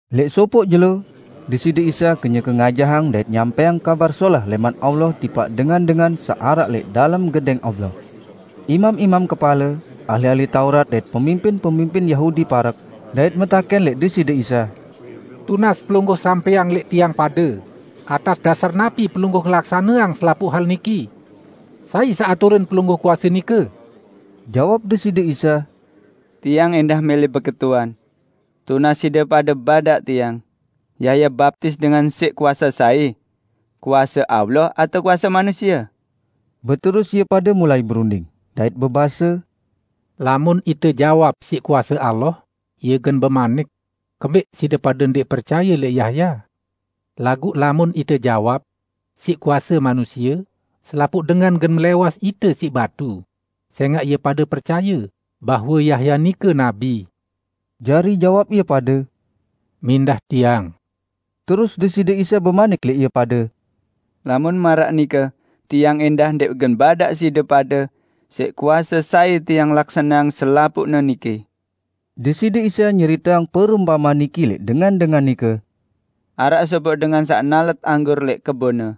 Lẽq sopoq jelo, Deside Isa kenyeke ngajahang dait nyampẽang Kabar Solah lẽman Allah tipaq dengan-dengan saq araq lẽq dalem Gedẽng Allah. Imam-imam kepale, ahli-ahli Taurat dait pemimpin-pemimpin Yahudi parek dait metakẽn lẽq Deside Isa, "Tunas Pelungguh sampẽang lẽq tiang pade atas dasar napi Pelungguh ngelaksaneang selapuq hal niki? Sai saq aturin Pelungguh kuase nike?" Jawab Deside Isa, "Tiang ẽndah mẽlẽ beketuan. Tunas side pade badaq Tiang, Yahya baptis dengan siq kuase sai? Kuase Allah atao kuase manusie?" Beterus ie pade mulai berunding, dait bebase, "Lamun ite jawab siq kuase Allah, Ie gen bemanik, 'Kembẽq side pade ndẽq percaye lẽq Yahya?' Laguq lamun ite jawab, 'Siq kuase manusie,' selapuq dengan gen melẽwas ite siq batu, sẽngaq ie pade percaye bahwe Yahya nike nabi." Jari jawab ie pade, "Mindah tiang." Terus Deside Isa bemanik lẽq ie pade, "Lamun maraq nike Tiang ẽndah ndẽq gen badaq side pade siq kuase sai Tiang laksaneang selapuqne niki." Deside Isa nyeriteang perumpamean niki lẽq dengan-dengan nike, "Araq sopoq dengan saq nalet anggur lẽq kebonne.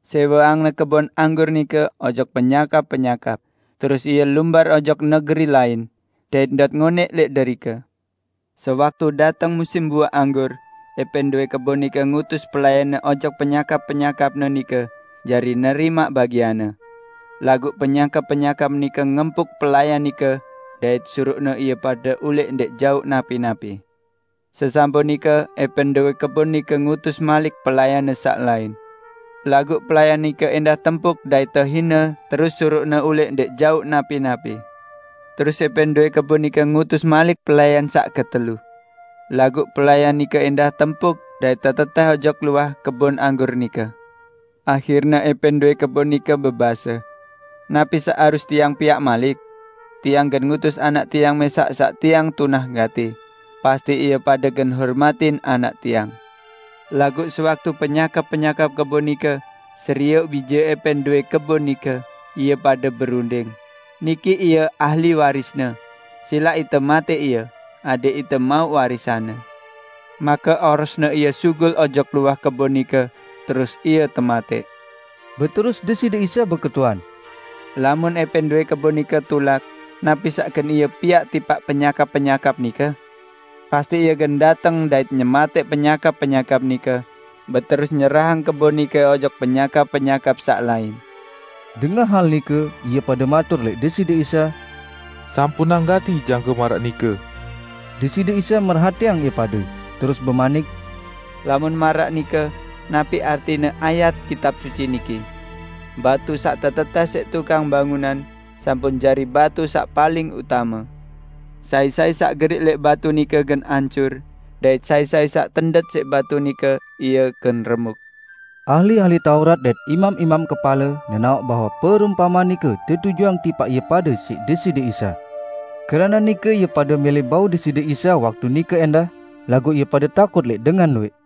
Sẽweangne kebon anggur nike ojok penyakap-penyakap, terus ie lumbar ojok negeri lain, dait ndot ngonẽq lẽq derike. Sewaktu dateng musim buaq anggur, ẽpẽn dowẽ kebon nike ngutus pelayanne ojok penyakap-penyakapne nike jari nerimaq bagianne. Laguq penyakap-penyakap nike ngempuk pelayan nike dait suruqne ie pade ulẽq ndẽq jauq napi-napi. Sesampun nike ẽpẽn dowẽ kebon nike ngutus malik pelayanne saq lain; laguq pelayan nike ẽndah tempuk dait tehine terus suruqne ulẽq ndẽq jauq napi-napi. Terus ẽpẽn dowẽ kebon nike ngutus malik pelayan saq ketelu. Laguq pelayan nike ẽndah tempuk dait tetetẽh ojok luah kebon anggur nike. Ahirne ẽpẽn dowẽ kebon nike bebase, 'Napi saq harus tiang piaq malik? Tiang gen ngutus anak tiang mẽsaq saq tiang tunah gati, pasti ie pade gen hormatin anak tiang!' Laguq sewaktu penyakap-penyakap kebon nike serioq bije ẽpẽn dowẽ kebon nike, ie pade berunding, 'Niki ie ahli warisne, silaq ite matẽq ie, adẽq ite mauq warisanne.' Make orosne ie sugul ojok luah kebon nike terus ie tematẽq." Beterus Deside Isa beketuan, "Lamun ẽpẽn dowẽ kebon nike tulak, napi saq gen ie piaq tipaq penyakap-penyakap nike? Pasti ie gen dateng dait nyematẽq penyakap-penyakap nike, beterus nyerahang kebon nike ojok penyakap-penyakap saq lain." Dengah hal nike, ie pade matur lẽq Deside Isa, "Sampunang gati jangke maraq nike!" Deside Isa merhatiang ie pade, terus bemanik, "Lamun maraq nike napi artine ayat Kitab Suci niki? 'Batu saq tetetẽh siq tukang bangunan, sampun jari batu saq paling utame.' Sai-sai saq geriq lẽq batu nike gen ancur, dait sai-sai saq tendet siq batu nike, ie gen remuk." Ahli-ahli Taurat dait imam-imam kepale nenaoq bahwe perumpamean nike tetujuang tipaq ie pade siq Deside Isa. Keranaq nike ie pade mẽlẽ bau Deside Isa waktu nike ẽndah, laguq ie pade takut lẽq dengan luwẽq.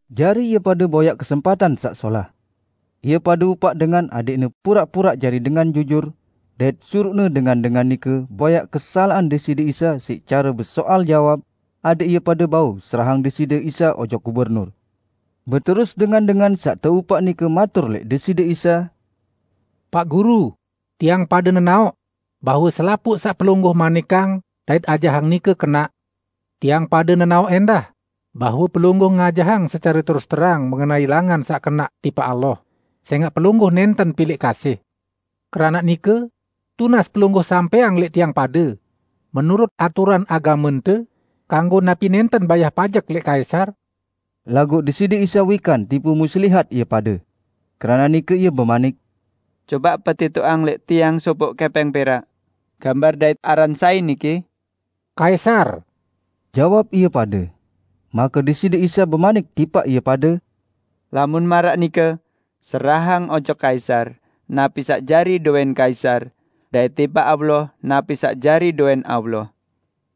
Jari ie pade boyaq kesempatan saq solah. Ie pade upaq dengan adẽqne puraq-puraq jari dengan jujur, dait suruqne dengan-dengan nike boyaq-boyaq kesalaqan Deside Isa siq care besoal jawab, adẽq ie pade bau serahang Deside Isa ojok gubernur. Beterus dengan-dengan saq teupaq nike matur lẽq Deside Isa, "Paq Guru, tiang pade nenaoq bahwe selapuq saq Pelungguh manikang dait ajahang nike kenaq. Tiang pade nenaoq ẽndah bahwe Pelungguh ngajahang secare terus-terang mengenai langan saq kenaq tipaq Allah, sẽngaq Pelungguh nẽnten pilẽq kasih. Keranaq nike, tunas Pelungguh sampẽang lẽq tiang pade, menurut aturan agamente, kanggo napi nẽnten bayah pajek lẽq Kaisar?" Laguq Deside Isa wikan tipu muslihat ie pade. Keranaq nike Ie bemanik, "Cobaq petitoqang lẽq Tiang sopoq kẽpẽng perak. Gambar dait aran sai niki?" "Kaisar!" jawab ie pade. Make Deside Isa bemanik tipaq ie pade, "Lamun maraq nike, serahang ojok Kaisar, napi saq jari dowẽn kaisar, dait tipaq Allah napi saq jari dowẽn Allah."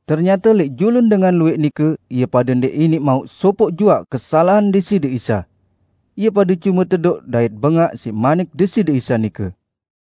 Ternyate lẽq julun dengan luwẽq nike ie pade ndẽq iniq mauq sopoq juaq kesalaqan Deside Isa. Ie pade cume tedoq dait bengaq siq manik Deside Isa nike.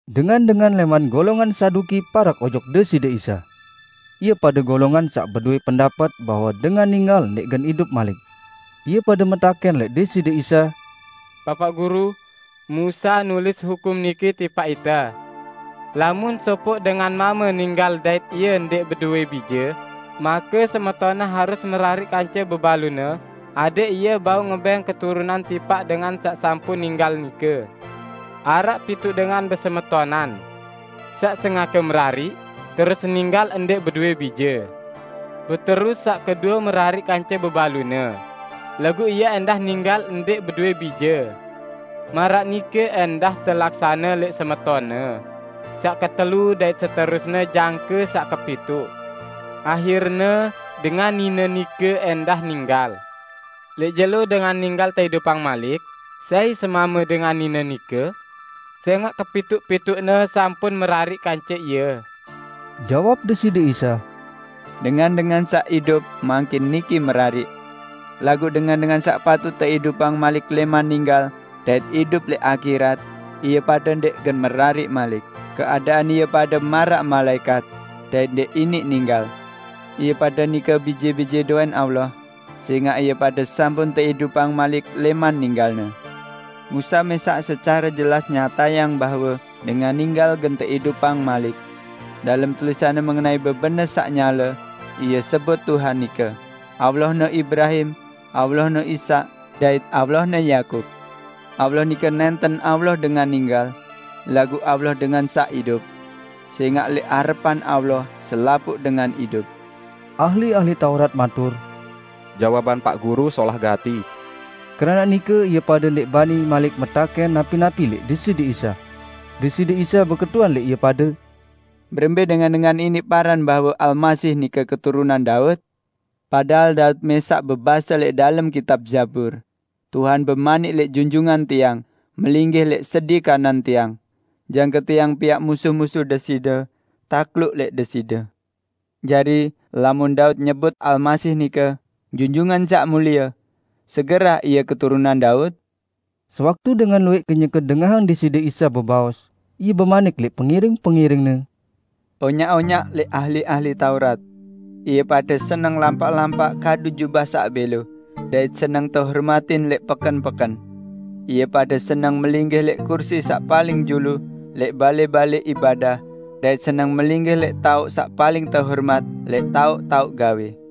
Dengan-dengan lẽman golongan Saduki parek ojok Deside Isa. (Ie pade golongan saq bedowẽ pendapet bahwe dengan ninggal ndẽq gen idup malik). Ie pade metakẽn lẽq Deside Isa, "Bapaq Guru, Musa nulis hukum niki tipaq ite: Lamun sopoq dengan mame ninggal dait ie ndẽq bedowẽ bije, make semetonne harus merariq kance bebalune adẽq ie bau ngebẽng keturunan tipaq dengan saq sampun ninggal nike. Araq pituq dengan besemetonan. Saq sengake merariq, terus ninggal ndẽq bedowẽ bije. Beterus saq kedue merariq kance bebalune, laguq ie ẽndah ninggal ndẽq bedowẽ bije. Maraq nike ẽndah telaksane lẽq semetonne saq ketelu dait seterusne jangke saq kepituq. Ahirne dengan nine nike ẽndah ninggal. Lẽq jelo dengan ninggal teidupang malik, sai semame dengan nine nike? Sẽngaq kepituq-pituqne sampun merariq kance ie." Jawab Deside Isa, "Dengan-dengan saq idup mangkin niki merariq, laguq dengan-dengan saq patut teidupang malik lẽman ninggal dait idup lẽq akhirat, ie pade merariq malik. Keadaan ie pade maraq malaẽkat, dait ndẽq iniq ninggal. Ie pade nike bije-bije dowẽn Allah, sẽngaq ie pade sampun teidupang malik lẽman ninggalne. Musa mẽsaq secare jelas nyatayang bahwe dengan ninggal gen teidupang malik. Dalem tulisanne mengenai bebenes saq nyale, ie sebut Tuhan nike 'Allahne Ibrahim, Allahne Ishak dait Allahne Yakub'. Allah nike nẽnten Allah dengan ninggal, laguq Allah dengan saq idup! Sẽngaq lẽq arepan Allah, selapuq dengan idup." Ahli-ahli Taurat matur, "Jawaban Paq Guru solah gati." Keranaq nike ie pade ndẽq bani malik metakẽn napi-napi lẽq Deside Isa. Deside Isa beketuan lẽq ie pade, "Berembẽ dengan-dengan iniq paran bahwe Almasih nike keturunan Daud? Padahal Daud mẽsaq bebase lẽq dalem kitab Zabur, 'Tuhan bemanik lẽq Junjungan Tiang: Melinggih lẽq sedi kanan Tiang, jangke Tiang piaq musuh-musuh Deside takluk lẽq Deside.' Jari, lamun Daud nyebut Almasih nike 'Junjungan Saq Mulie', segerah Ie keturunan Daud?" Sewaktu dengan luwẽq kenyeke dengahang Deside Isa bebaos, Ie bemanik lẽq pengiring-pengiring-Ne, "Onyaq-onyaq lẽq ahli-ahli Taurat. Ie pade seneng lampaq-lampaq kadu jubah saq bẽlo, dait seneng tehormatin lẽq peken-peken. Ie pade seneng melinggih lẽq kursi saq paling julu lẽq balẽ-balẽ ibadah dait seneng melinggih lẽq taoq saq paling tehormat lẽq taoq-taoq gawẽ.